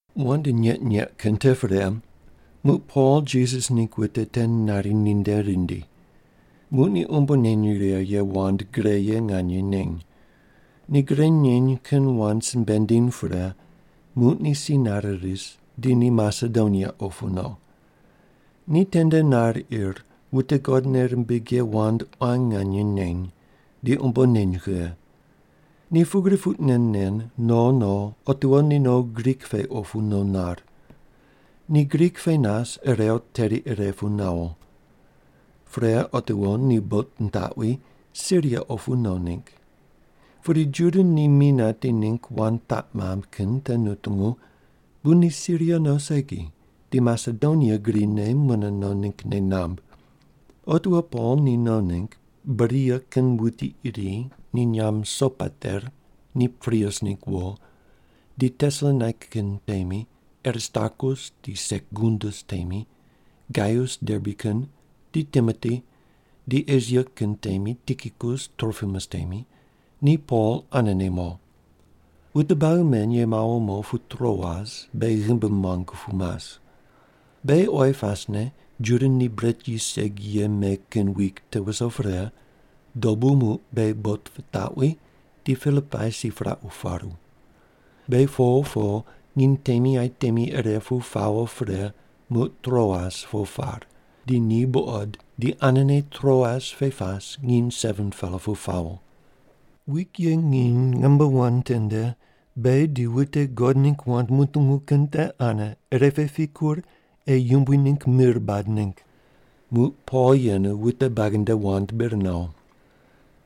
Wand nyeq nyeq kin te pre, muq Pol Jisas ningg wute te nari ninde rindi. Muq ni umbo neny righe ye wand gre ye nganye neny. Ni gre neny kin wand simbe nindiny pre, muq ni si nare ris, di ni Masedonia opu no. Ni tende nar ir, wute God nei rimbig ye wand quan nganye neny, di umbo neny kughe. Ni pugri puq nen nen no no otiwo ni no Grik pe opu no nar. Ni Grik pe nas irew teri ire pu nawo. Pre otiwo ni bot nitaqwi, Siria opu no ningg. Pudi Juda ni mi nati ningg wand taq mamb kin te nutungu, bu ni Siria no segi, di Masedonia grine mune no ningg nei namb. Otiwo Pol ni no ningg, Beria kin wuti iri, ni nyamb Sopater ni Pirus ningg wo, di Tesalonaika kin temi, Aristarkus di Sekundus temi, Gaius Derbe kin, di Timoti, di Esia kin temi Tikikus Tropimus temi, ni Pol anene mo. Wute buagi men ye mawo mo pu Troas beghi ghimbi muangu pu mas. Beghi oyi pasne Juda ni bret yis segi ye me kin wik te wuso pre, dobu muq beghi bot pitaqwi, di Pilipai si piraq paru. Beghi po po nginy temi aye temi ire pu pawo pre muq Troas po par, di ni buqod di anene Troas pe pas nginy 7-pela pu pawo. Wik ye nginy namba wan tende beghi di wute God ningg wand mutungu kin te ane ire pe pikur ei Yumbui ningg mir bad ningg. Muq Pol yenu wute buagi nde wand bir nawo.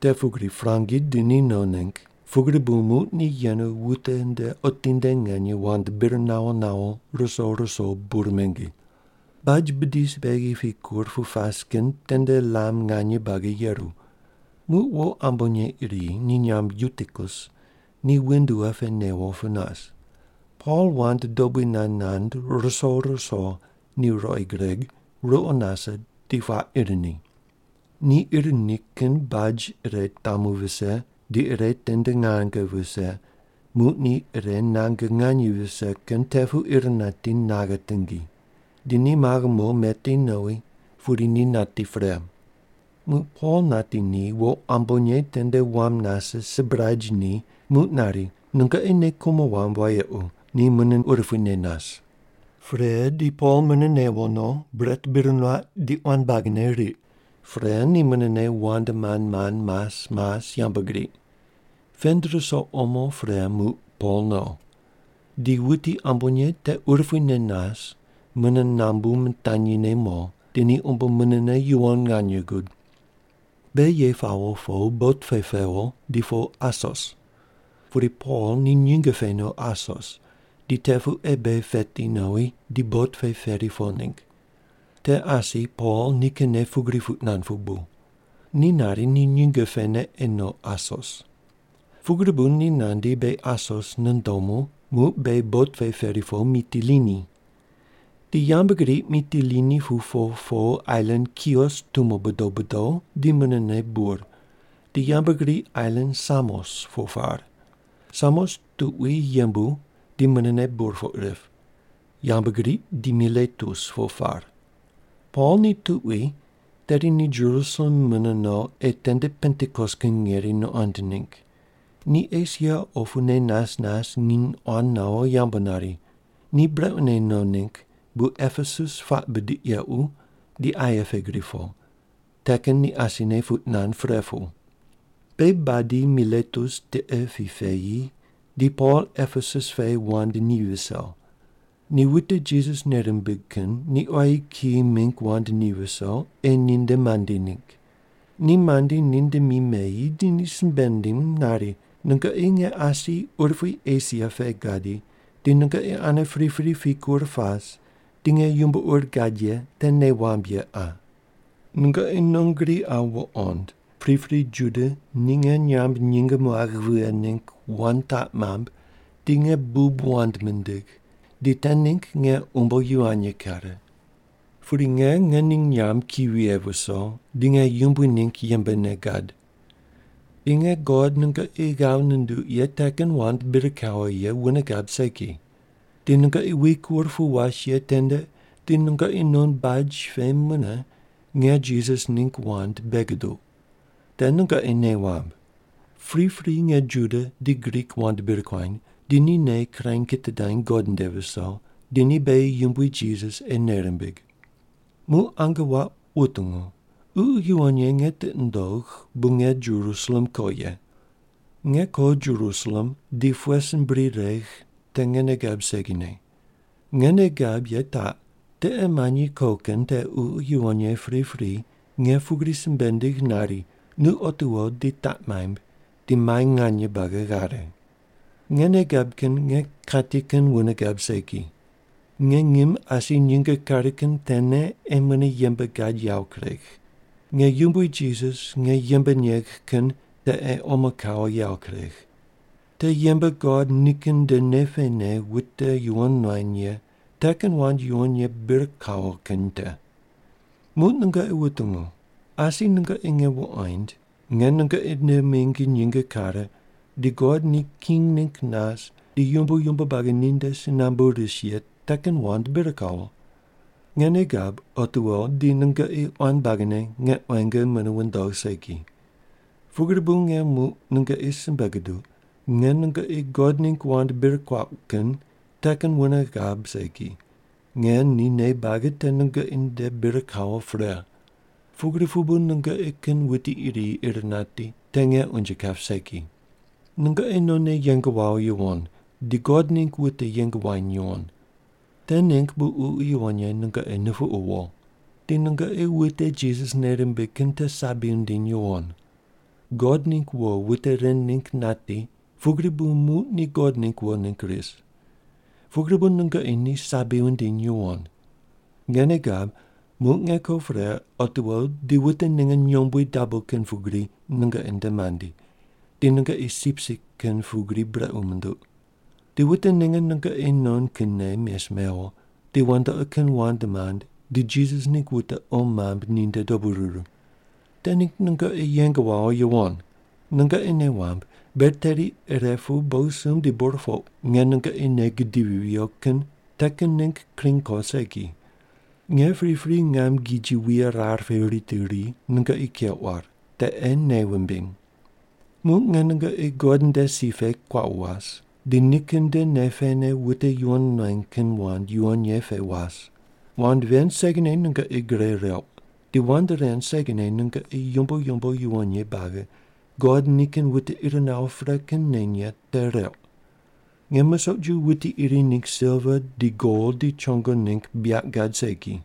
Te pugri prangi di ni no ningg, pugri bu muq ni yenu wute nde otinde nganye wand bir nawo nawo ruso ruso bur mingi. Baj bidi beghi pikur pu pas kin tende lam nganye buagi yeru. Muq wo ambonye iri, ni nyamb Yutikus, ni windua pe newo pu nas. Pol wand dobui nand nand ruso ruso ni ruqoi gureg, ruqo nase di puaq ir ni. Ni ir ni kin baj ire tamu vise di ire tende nange vise, muq ni ire nange nganye vise kin te pu ir nati naghe tingi. Di ni maghe mo meti nowi pudi ni nati pre. Muq Pol nati ni, wo ambonye tende wam nase sibraj ni muq nari, “Nungoqi nei kumo wamb wayequ, ni mune urupuine nas.” Pre di Pol mune newo no, bret bir nuaq di quan buagine riq. Pre ni munene wand mand mand mas mas yambgriq. Pend ruso omo pre muq Pol no. Di wuti ambonye te urupuine nas mune nambu mitanyine mo, di ni umbo munene yuwon nganye gud. Beghi ye pawo po bot pe pewo, di po Asos. Pudi Pol ni nyinge pe no Asos di te pu ei beghi peti nowi di bot pe peri po ningg. Te asi Pol nikinne pugri puq nand pu bu. Ni nari ni nyinge pene ei no Asos. Pugri bu ni nandi beghi Asos nundomu, muq beghi bot pe peri po Mitilini. Di yambgriq Mitilini pu po po ailan Kios tumo bodo bodo di munene bur, di yambgriq ailan Samos po par. Samos tuqui yembu di munene burpoq rip. Yambgriq di Miletus po par. Pol ni tuqui tedi ni Jerusalem mune no ei tende Pentikos kin ngeri nuqond ningg. Ni Esia opune nas nas nginy quan nawo yambu nari. Ni brequne no ningg bu Epesus puaq bidiq yequ di aye pe gri po, te kin ni asine puq nand pre pu. Beghi badi Miletus tiqe pi peyi di Pol Epesus pe wand ni viso. Ni wute Jisas nei rimbig kin ni quayi kiyi mingg wand ni viso ei ninde mandi ningg. Ni mandi ninde mi meyi di ni simbe nindim nari, “Nungoqi nge asi urupui Esia pe gadi di nungoqi ane pripri pikur pas di nge yumbo ur gad ye te nei wamb ye qa. Nungoqi non gri qa wuqond, pripri Juda ni nge nyamb nyinge muagh vighe ningg wand taq mamb di nge bub wand mindigh, di te ningg nge umbo yivany kare. Pudi nge ngening nyamb ki vighe viso, di nge Yumbui ningg yembene gad. Di nge God nungoqi ghav nunduq ye te kin wand bir kawo ye wune gab segi. Di nungoqi wikur pu was ye tende di nungoqi non baj pe mune nge Jisas ningg wand bei guduq. Te nungoqi nei wamb. Pripri nge Juda di Grik wand bir kuany, di ni nei kirany kitidany God nde viso, di ni beghi Yumbui Jisas ei nei rimbig. “Muq ange wuaq wutungu. Ququ Yuwon Ye nge tiqi nundogh, bu nge Jerusalem ko ye. Nge ko Jerusalem di pughe sin bri regh te nge nei gab segine. Nge nei gab ye taq: Tiqe manyi ko kin te Ququ Yuwon Ye pripri nge pugri simbe nindigh nari, ‘Nu otiwo di taq maimb, di mai nganye buagi ghare.’ Nge nei gab kin nge kati kin wune gab segi. Nge ngim asi nyinge kare kin tene ei mune yembe gad yawo kuregh. Nge Yumbui Jisas nge yembe negh kin te ei omo kawo yawo kuregh. Te yembe God nikin nde nei pene wute yuwon nuany ye te kin wand yuwon ye bir kawo kin te. “Muq nungoqi wutungu. Asi nungoqi nge wuqoind nge nungoqi nde mingi nyinge kare di God ni king ningg nas di yumbo yumbo buagi ninde si nambu rise ye te kin wand bir kawo. Nge nei gab, otiwo di nungoqi quan buagine nge quenge mune wundogh segi. Pugri bu nge muq nungoqi simbe guduq: Nge nungoqi God ningg wand bir kuauq kin te kin wune gab segi, nge ni nei buagi te nungoqi nde bir kawo pre. Pugri pu bu nungoqi kin wuti iri ir nati, te nge unje kap segi. “Nungoqi nonne yeng wawo yuwon, di God ningg wute yeng wuany yuwon. Te ningg bu Ququ Yuwon Ye nungoqi nupuqu wo. Di nungoqi wute Jisas nei rimbig kin te sabi wundiny yuwon. God ningg wo wute ren ningg nati pugri bu muq ni God ningg wo ningg ris. Pugri bu nungoqi ni sabi wundiny yuwon. Nge nei gab, muq nge ko pre otiwo di wute ninge nyombui dabo kin pugri nungoqi nde mandi, di nungoqi sipsip kin pugri brequ munduq. Di wute ninge nungoqi non kinne mes mewo, di wandoqi kin wand mand di Jisas ningg wute qo mamb ninde dobu ruru. Te ningg nungoqi yeng wawo yuwon. Nungoqi nei wamb, ber teri ire pu bogisumb di burpoq nge nungoqi nei gidivi viyo kin te kin ningg kring ko segi. Nge pripri ngam giji wuye rar pe ritiri ri nungoqi keuq war. Te ei nei wumbiny. “Muq nge nungoqi God nde si pe kuaqu was, di nikin nde nei pene wute yuwon nuany kin wand yuwon ye pe was. Wand ven segine nungoqi gre reuq, di wand ven segine nungoqi yumbo yumbo yuwon ye buagi God nikin wute ir nawo pre kin neny ye te reuq. Nge musoq ju wuti iri ningg silva di gol di chongo ningg buyaq gad segi.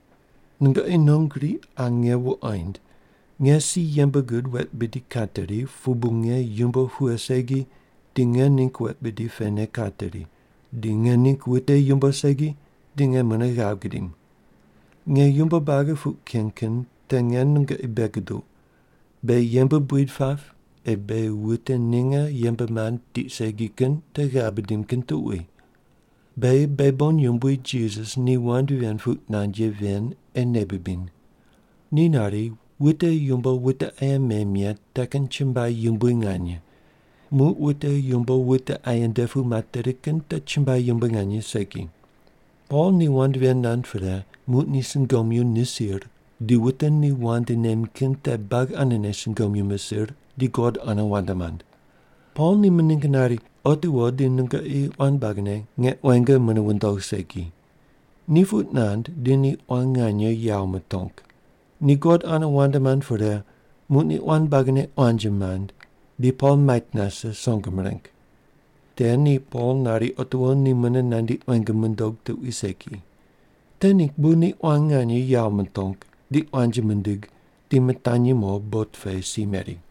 Nungoqi non gri qa nge wuqoind nge si yembe gud wet bidi kateri pu bu nge yumbo pughe segi di nge ningg wet bidi pene kateri, di nge ningg wute yumbo segi di ni mune ghav gidim. Nge yumbo buagi puq ken kin te nge nungoqi bei guduq, beghi yembe buid pap ei beghi wute ninge yembe mand tiq segi kin te ghav bidim kin tuqui. Beghi beghi bon Yumbui Jisas ni wand ven puq nand ye ven ei nei bibiny. Ni nari, ‘Wute yumbo wute aye mem ye te kin chumbuai yumbui nganye, muq wute yumbo wute aye nde pu materi kin te chumbuai yumbui nganye segi’.” Pol ni wand ven nand pre, muq ni sungomyu nisir, di wute ni wand nem kin te buagi anene sungomyu misir di God ane wand mand. Pol ni mining nari, “Otiwo di nungoqi quan buagine nge quenge mune wundogh segi.” Ni puq nand di ni quan nganye yawo mutong. Ni God ane wand mand pre, muq ni quan buagine quanji mand, di Pol mait nase, song mireng. Te ni Pol nari otiwo ni mune nandi quenge mundog tuqui segi. Te ningg bu ni quan nganye yawo mutong di quanji mindig di mitanyi mo bot pe si meri.